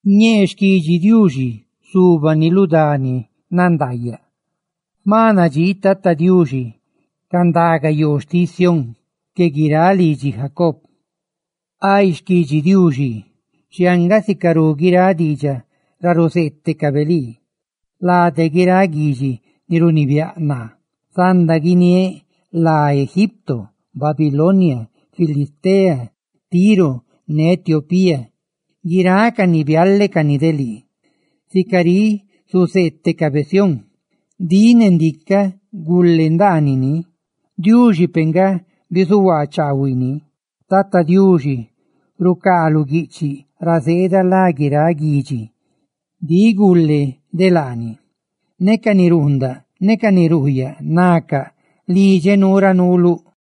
Ñee xquidxi Diuxizubani lu dani nandaayaꞌ. Jma nadxii Tata Diuxi ca ndaga yoo xtiꞌ Sión que guiráꞌ lidxi Jacob. Xquidxi Diuxi, xhianga sicarú guiráꞌ diidxaꞌ ra ruzeetecabe lii: «Lade guiráꞌ guidxi ni runibiáꞌ naa zanda guiniéꞌ lá Egipto, Babilonia, Filistea, Tiro ne Etiopía; guirácani zácani de lii.» Sica riꞌ zuzeetecabe Sión: «Ndiꞌ ne ndicaꞌ gule ndaanini.» Diuxi ni nandxóꞌ peꞌ nga bizuhuaa chaahuiꞌ ni. Tata Diuxi rucaa lu guiꞌchiꞌ ra cá lá guiráꞌ guidxi: «Ndiꞌ za de laani.» Ne ca ni runndaꞌ ne ca ni ruyaa, nacaꞌ: «Lidxeꞌ nuu ne lii.»